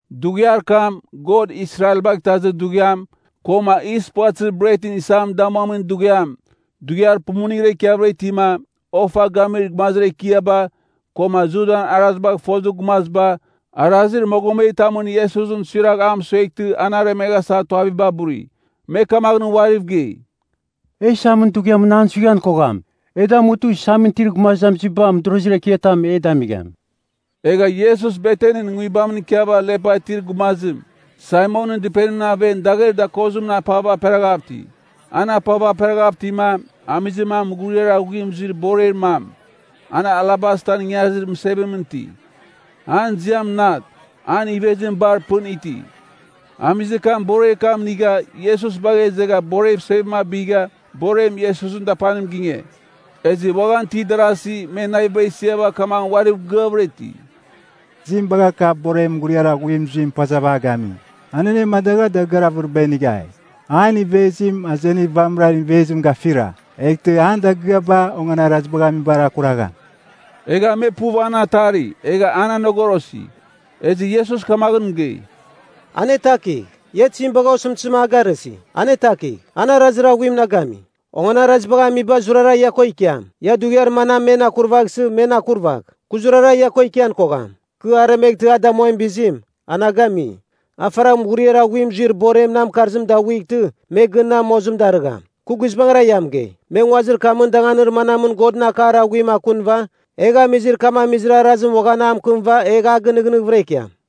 Dughiar kam, God Israelbagh Itazir Dughiam, koma Yis Puvatɨzir Bretɨn Isam Damuamin Dughiam, dughiar pumuningra ikiavɨra itima, ofa gamir gumazir ekiaba, koma Judan arazibagh fozir gumaziba, arazir mogometamɨn Iesusɨn suiragh amɨsueghtɨ an aremeghasa tuaviba buri. Me kamaghɨn uariv gei, “E isamɨn dughiamɨn an suighan kogham. E damutɨ isamɨn itir gumazamiziba mɨdorozir ekiatam e damigham.” Egha Iesus Betanin nguibamɨn ikiava lepa itir gumazim Saimonɨn dɨpenimɨn aven dagher dakozimɨn apava aperaghav iti. An apava aperaghav itima, amizir mam mughuriar aghuim zuir borer mam. An alabastan ingarizir mɨsevimɨn iti. An ziam nat, an ivezim bar pɨn iti. Amizir kam borer kam inigha Iesus bagha izegha borev sevim abigha borem Iesusɨn dapanim ginge. Ezɨ uaghan itir darasi me naviba isiava kamaghɨn uariv gɨavɨra iti, “Tizim bagha kav borer mughuriar aghuim zuim pazava a gami? An anemadagha dagɨar avɨriba inighai. An ivezim azenir vamɨran ivezim gafira. Eghtɨ an dagɨaba onganarazibagh amibar akuragham.” Egha me puv an atari, egha an anogorosi. Ezɨ Iesus kamaghɨn mɨgei, “Anetakigh. Ia tizim bagha osɨmtɨzim a garɨsi? Anetakigh! An arazir aghuim na gami. Onganarazibagh amiba zurara ia ko ikiam. Ia dughiar manam men akurvaghsɨ, men akurvagh. Kɨ zurara ia ko ikian kogham. Kɨ aremeghtɨ a damuamin bizim, a na gami. A faragh mughuriar aghuim zuir borem nan mɨkarzim daghuightɨ me gɨn na mozim darɨgham. Kɨ guizbangɨra ia mɨgei, me nguazir kamɨn danganir manamɨn Godɨn akar aghuim akunɨva egh amizir kam amizir arazim uaghan a mɨkɨmɨva egh a gɨnɨghnɨghɨvɨra ikiam.”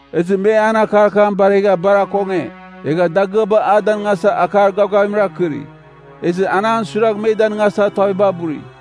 Ezɨ me an akar kam baregha bar akonge, egha dagɨaba a danɨngasa akar gavgavim arkɨri. Ezɨ an an suiragh me danɨngasa tuaviba buri.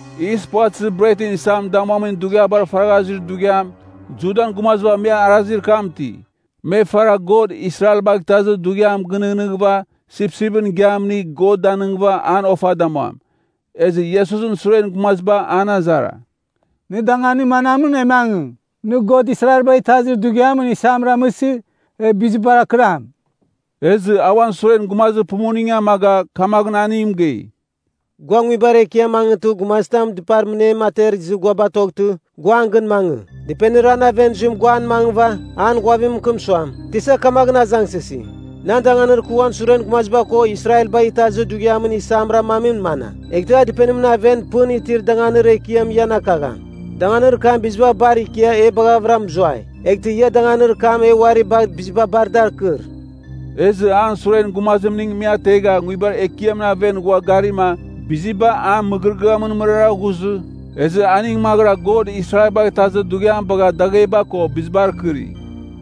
Yis Puvatɨzir Bretɨn Isam Damuamin Dughiabar faragha zuir dughiam, Judan gumaziba me arazir kam iti. Me faragh God Israelbagh Itazir Dughiam gɨnɨghnɨghɨva sipsipɨn igiam inigh God danighɨva an ofa damuam. Ezɨ Iesusɨn suren gumaziba an azara, “Nɨ danganir manamɨn, e mangɨ, nɨ God Israelbagh Itazir Dughiamɨn isam ramɨsɨ, e bizibar akɨram?” Ezɨ a uan suren gumazir pumuning amaga kamaghɨn aning mɨgei, “Gua nguibar ekiamɨn mangɨtɨ gumazitam dɨpar mɨnem ater izɨ gua batoghtɨ, gua an gɨn mangɨ. Dɨpenir an aven zuim gua an mangɨva an ghuavim mɨkɨm suam, ‘Tisa kamaghɨn azangsɨsi, “Nan danganir kɨ uan suren gumaziba ko Israelbagh Itazir Dughiamɨn isamar amamim mana?” ’ Eghtɨ a dɨpenimɨn aven pɨn itir danganir ekiam ian akagham. Danganir kam biziba bar ikia e baghavɨra mɨzuai. Eghtɨ ia danganir kam e uari bagh biziba bar dar akɨr.” Ezɨ an suren gumazimning me ategha nguibar ekiamɨn aven ghua garima biziba a mɨgɨrɨgɨamɨn mɨrara ghuzɨ, ezɨ aning maghɨra God Israelbagh Itazir Dughiam bagha dagheba ko bizibar kɨri.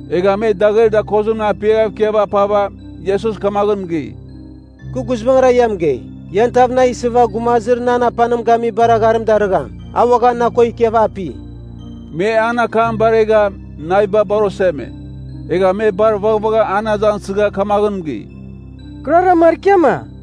Egha me dagher dakozimɨn apiaghav ikiava apava, Iesus kamaghɨn mɨgei, “Kɨ guizbangɨra ia mɨgei, ian tav na isɨva gumazir nan apanim gamibar agharim darɨgham, a uaghan na ko ikiava api.” Me an akam baregha, naviba bar oseme. Egha me bar vaghvagha an azangsɨgha kamaghɨn mɨgei, “Kɨrara markiama?”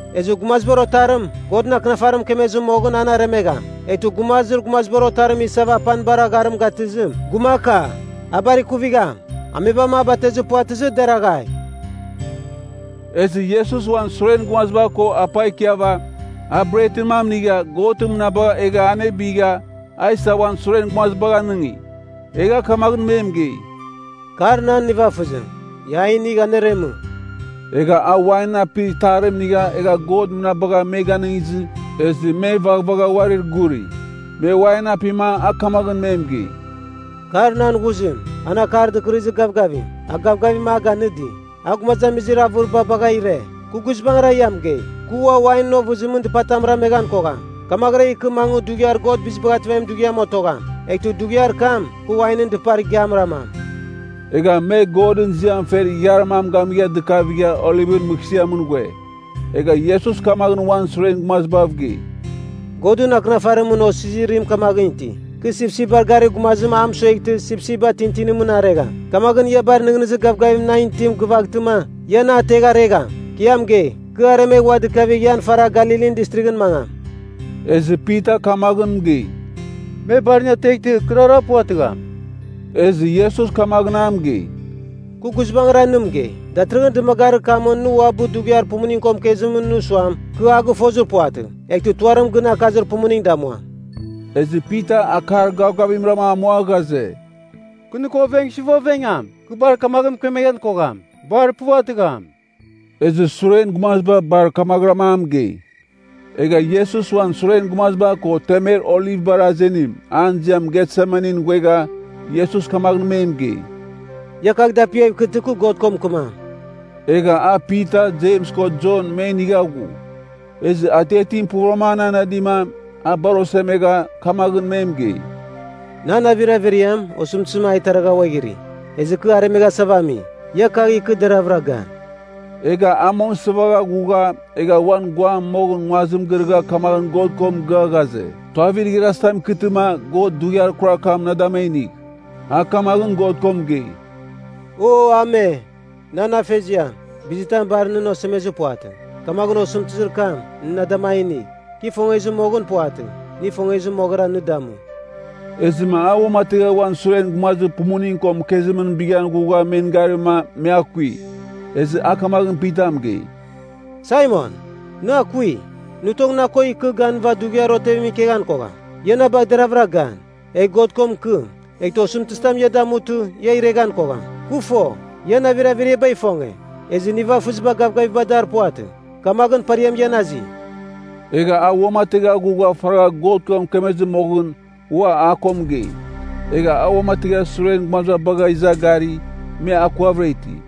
Ezɨ Gumazibar Otarim, Godɨn Akinafarim mɨkemezir moghɨn, an aremegham. Eghtɨ gumazir Gumazibar Otarim isava apanibar agharim gatɨzim, gumaka! A bar ikuvigham! Amebam a batezir puvatɨzɨ, deraghai!” Ezɨ Iesus uan suren gumaziba ko apa ikiava, a bretɨn mam inigha God mɨnabagha egha anebigha, a isa uan suren gumazibagh anɨngi. Egha kamaghɨn me mɨgei, “Kar nan nivafɨzim. Ia a inigh aneremɨ.” Egha a wain apir itarim inigha egha God mɨnabagha me ganɨngizɨ, ezɨ me vaghvagha uarir guri. Me wain apima a kamaghɨn me mɨgei, “Kar nan ghuzim, an Akar Dɨkɨrɨzir Gavgavim, a gavgavim a ganɨdi. A gumazamizir avɨriba bagha ire. Kɨ guizbangɨra ia mɨgei, Kɨ uam wainɨn ovɨzimɨn dɨpatam rameghan kogham, kamaghɨra ikɨ mangɨ Dughiar God Bizibagh Ativamimɨn otogham. Eghtɨ dughiar kam, kɨ wainɨn dɨpar igiam ramam.” Egha me Godɨn ziam fer ighiar mam gamigha dɨkavigha Olivɨn Mɨghsɨamɨn ghue. Egha Iesus kamaghɨn uan suren gumazibav gei, “Godɨn Akɨnafarimɨn osizirim kamaghɨn iti, ‘Kɨ sipsipbar garir gumazim a mɨsueghtɨ sipsipba tintinimɨn aregham.’ Kamaghɨn ia bar nɨghnɨzir gavgavim nan itim gɨvaghtɨma, ia na ategh aregham. Kɨ ia mɨgei, kɨ aremegh ua dikavigh ian faragh Galilin Distrighɨn mangam.” Ezɨ Pita kamaghɨn mɨgei, “Me bar nɨ ateghtɨ kɨrara puvatɨgham.” Ezɨ Iesus kamaghɨn a mɨgei, “Kɨ guizbangɨra nɨ mɨgei, datɨrɨghɨn dɨmagarir kamɨn nɨ uabɨ dughiar pumuning ko mɨkezim nɨ suam, ‘Kɨ a gɨfozir puvatɨ,’ eghtɨ tuarim gɨn akazir pumuning damuam.” Ezɨ Pita akar gavgavimra amua ghaze, “Kɨ nɨ ko ovengsɨva ovengam, kɨ bar kamaghɨn mɨkemeghan kogham. Bar puvatɨgham!” Ezɨ suren gumaziba bar kamaghɨram a mɨgei. Egha Iesus uan suren gumaziba ko temer olivbar azenim, an ziam Getsemanin ghuegha, Iesus kamaghɨn me mɨgei, “Ia kagh dapiaghɨv kɨtɨ kɨ God ko mɨkɨmam.” Egha a Pita, Jems ko Jon me inigha ghu. Ezɨ atiatim puvɨram an anadima, a bar osemegha, kamaghɨn me mɨgei, “Nan navir averiam, osɨmtɨzim a iteragha ghuaghiri. Ezɨ kɨ aremeghasava ami. Ia kagh ikɨ, deravɨra gan.” Egha a mong isɨvagha ghugha, egha uan guam moghɨn nguazim girɨgha kamaghɨn God ko mɨgɨa ghaze, tuavir igharazitam ikɨtɨma God dughiar kurar kam na dam a inigh. A kamaghɨn God ko mɨgei, “O Ame, nan afeziam, bizitam bar nɨn osemezir puvatɨ. Kamaghɨn osɨmtɨzir kam, nɨ na dam a inigh. Kɨ ifongezir moghɨn puvatɨ, nɨ ifongezir moghɨra, nɨ damu.” Ezɨma a uamategha uan suren gumazir pumuning ko mɨkezimɨn bighan ghugha garima me akui. Ezɨ a kamaghɨn Pita mɨgei, “Saimon, nɨ akui? Nɨ tong na ko ikɨ ganɨva dughiar otevimɨn ikeghan kogham? Ia na bagh deravɨra gan, egh God ko mɨkɨm, eghtɨ osɨmtɨzitam ia damutɨ, ia ireghan kogham. Kɨ fo, ian navir averiaba ifonge, ezɨ nivafɨziba gavgaviba dar puvatɨ. Kamaghɨn pariam ian azi.” Egha a uamategha ghugha faragha God ko mɨkemezɨ moghɨn ua a ko mɨgei. Egha a uamategha suren gumaziba bagha iza gari, me akuavɨra iti.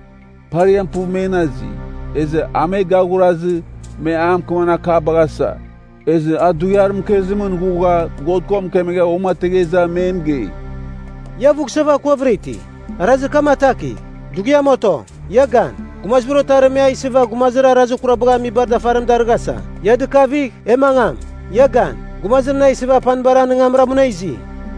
Pariam puv men azi. Ezɨ a me gaghurazɨ, me a mɨkɨmamin akabagh asa. Ezɨ a dughiar mɨkezimɨn ghugha God ko mɨkemegha uamategha iza me mɨgei, “Ia avughsava akuavɨra iti? Arazir kam atakigh! Dughiam oto. Ia gan, Gumazibar Otarim me a isɨva gumazir arazir kurabagh amibar dafarim darɨghasa. Ia dɨkavigh! E mangam! Ia gan. Gumazir na isɨva apanibar anɨngamra muna izi!”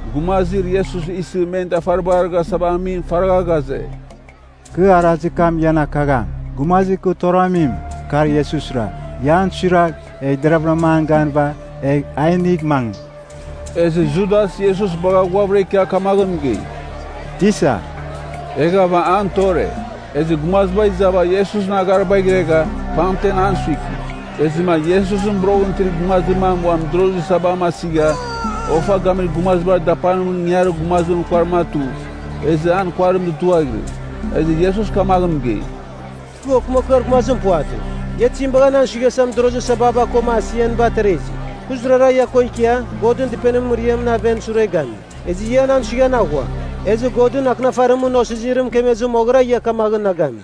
Gumazir Iesus isɨ men dafaribar arɨghasava amim faragha ghaze, “Kɨ arazir kam ian akagham. Gumazir kɨ toramim, kar Iesusra. Ia an suiragh, egh deraghvɨra an ganɨva, egh a inigh mangɨ.” Ezɨ Judas Iesus bagha ghuavɨra ikia kamaghɨn mɨgei, “Tisa!” Eghava an tore. Ezɨ gumaziba izava Iesusɨn agharibagh iregha, pamtem an suiki. Ezɨma Iesusɨn boroghɨn itir gumazir mam uan mɨdorozir sabam asigha, ofa gamir gumazibar dapanimɨn ingangarir gumazimɨn kuarim atu, ezɨ an kuarim dutuaghirɨ. Ezɨ Iesus kamaghɨn mɨgei, “Kɨ okɨmakɨar gumazim puvatɨ. Ia tizim bagha nan suighasa mɨdorozir sababa koma asianiba atera izi? Kɨ zurara ia ko ikia, Godɨn Dɨpenimɨn mɨriamɨn aven sure gami. Ezɨ ia nan suighan aghua. Ezɨ Godɨn Akɨnafarimɨn osizirim mɨkemezir moghɨra ia kamaghɨn na gami.”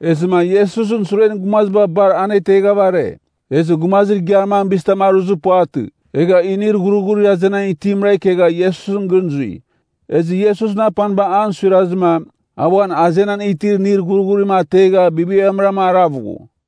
Ezɨma Iesusɨn suren gumaziba bar aneteghava are. Ezɨ gumazir igiar mam bizitam aruzir puvatɨ, egha inir ghurghurir azenan itimra ikegha Iesusɨn gɨn zui. Ezɨ Iesusɨn apaniba an suirazɨma, a uan azenan itir inir ghurghurim ategha bibiamrama arav ghu.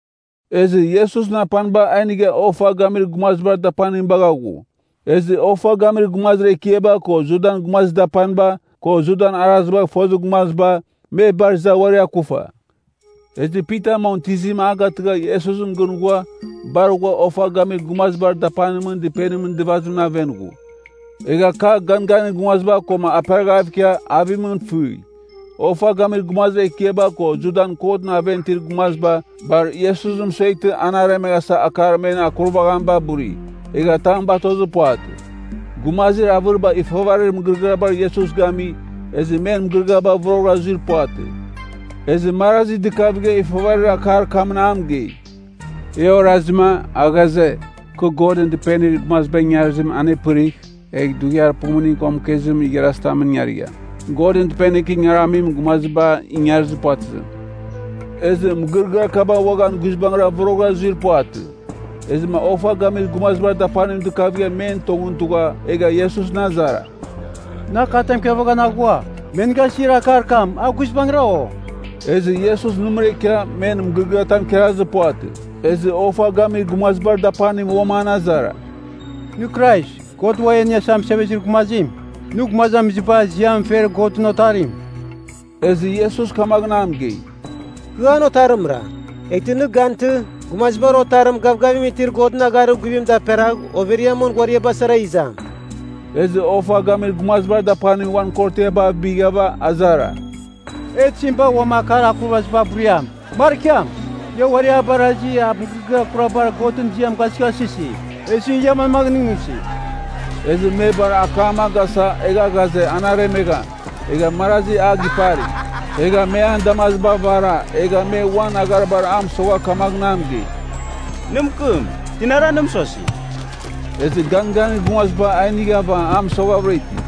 Ezɨ Iesusɨn apaniba a inigha ofa gamir gumazibar dapanim bagha ghu. Ezɨ ofa gamir gumazir ekiaba ko Judan gumazir dapaniba, ko Judan arazibagh fozir gumaziba, me bar iza uari akufa. Ezɨ Pita mong tɨzim a gatɨgha Iesusɨn gɨn ghua bar ghua ofa gamir gumazibar dapanimɨn dɨpenimɨn dɨvazimɨn aven ghu. Egha kagh ganganir gumaziba koma aperaghav ikia avimɨn fɨi. Ofa gamir gumazir ekiaba koma Judan kotɨn aven itir gumaziba bar Iesusɨn mɨsueghtɨ an aremeghasa akar men akurvaziba buri, egha tam batozir puvatɨ. Gumazir avɨriba ifavarir mɨgɨrɨgɨabar Iesus gami, ezɨ men mɨgɨrɨgɨaba voroghɨra zuir puvatɨ. Ezɨ marazi dɨkavigha ifavarir akar kamɨn a mɨgei, “E orazima, a ghaze, ‘Kɨ Godɨn Dɨpenir gumaziba ingarizim anepɨrigh, egh dughiar pumuning ko mɨkezimɨn igharazitamɨn ingarigham. Godɨn Dɨpenir kɨ ingaramim gumaziba ingarizir puvatɨzim.’” Ezɨ mɨgɨrɨgɨar kaba uaghan guizbangɨra voroghɨra zuir puvatɨ. Ezɨma ofa gamir gumazibar dapanim dɨkavigha men tongɨn tugha egha Iesusɨn azara, “Nɨ akatam ikarvaghan aghua? Me nɨ gasir akar kam, a guizbangɨra, o?” Ezɨ Iesus nɨmɨra ikia men mɨgɨrɨgɨatam ikarazir puvatɨ. Ezɨ ofa gamir gumazibar dapanim uam an azara, “Nɨ Krais, God Uam E Iniasa Mɨsevezir Gumazim? Nɨ gumazamiziba ziam fer Godɨn Otarim?” Ezɨ Iesus kamaghɨn a mɨgei, “Kɨ an Otarimra. Eghtɨ nɨ gantɨ, Gumazibar Otarim gavgavim itir Godɨn agharir guvim daperagh overiamɨn ghuariaba sara izam.” Ezɨ ofa gamir gumazibar dapanim uan korotiaba abighava azara, “E tizim bagh ua akar akurvaziba buriam? Markiam! Ia uari a barasi, a mɨgɨrɨgɨar kurabar Godɨn ziam gasɨghasɨsi. Ezɨ ia manmaghɨn nɨghnɨsi?” Ezɨ me bar akam a gasa, egha ghaze an aremegham. Egha marazi a gipari. Egha me an damaziba avara, egha me uan agharibar a mɨsogha kamaghɨn mɨgei, “Nɨ mɨkɨm. Tinara nɨ mɨsosi?” Ezɨ ganganir gumaziba a inighava a mɨsoghavɨra iti.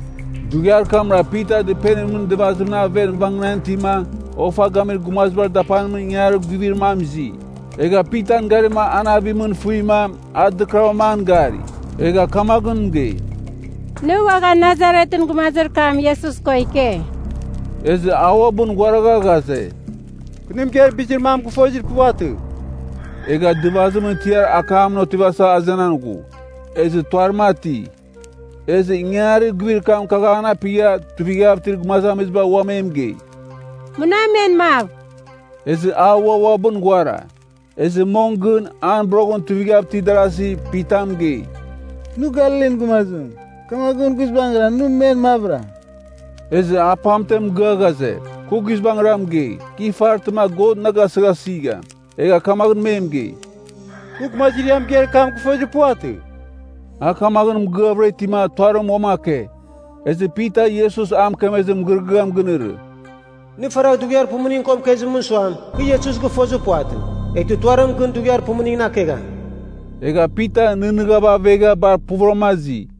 Dughiar kamra Pita dɨpenimɨn dɨvazimɨn aven vangɨnan itima, ofa gamir gumazibar dapanimɨn ingangarir guivir mam izi. Egha Pitan garima an avimɨn fɨima, a dɨkɨravɨram an gari. Egha kamaghɨn mɨgei, “Nɨ uaghan Nasaretɨn gumazir kam, Iesus ko ike.” Ezɨ a uabɨn ghuaragha ghaze, “Kɨ nɨ mɨgeir bizir mam gɨfozir puvatɨ.” Egha dɨvazimɨn tiar akar ekiamɨn otivasa azenan ghu. Ezɨ tuarim ati. Ezɨ ingangarir guivir kam kagh an apigha tuivighav itir gumazamiziba ua me mɨgei, “Muna men mav.” Ezɨ a ua uabɨn ghuara. Ezɨ mong gɨn, an boroghɨn tuivighav itir darasi Pita mɨgei, “Nɨ Galilin gumazim, kamaghɨn guizbangɨra nɨ men mavɨra.” Ezɨ a pamtem mɨgɨa ghaze, Kɨ guizbangɨra mɨgei, kɨ ifaraghtɨma God na gasɨghasigham. Egha kamaghɨn me mɨgei, “Kɨ gumazir ia mɨgeir kam gɨfozir puvatɨ.” A kamaghɨn mɨgɨavɨra itima tuarim uam ake. Ezɨ Pita Iesus a mɨkemezir mɨgɨrɨgɨam ginɨrɨ, “Nɨ faragh dughiar pumuning ko mɨkezimɨn suam, kɨ Iesus gɨfozir puvatɨ, eghtɨ tuarim gɨn dughiar pumuningɨn akegham.” Egha Pita nɨghnɨghava avegha bar puvɨrama azi.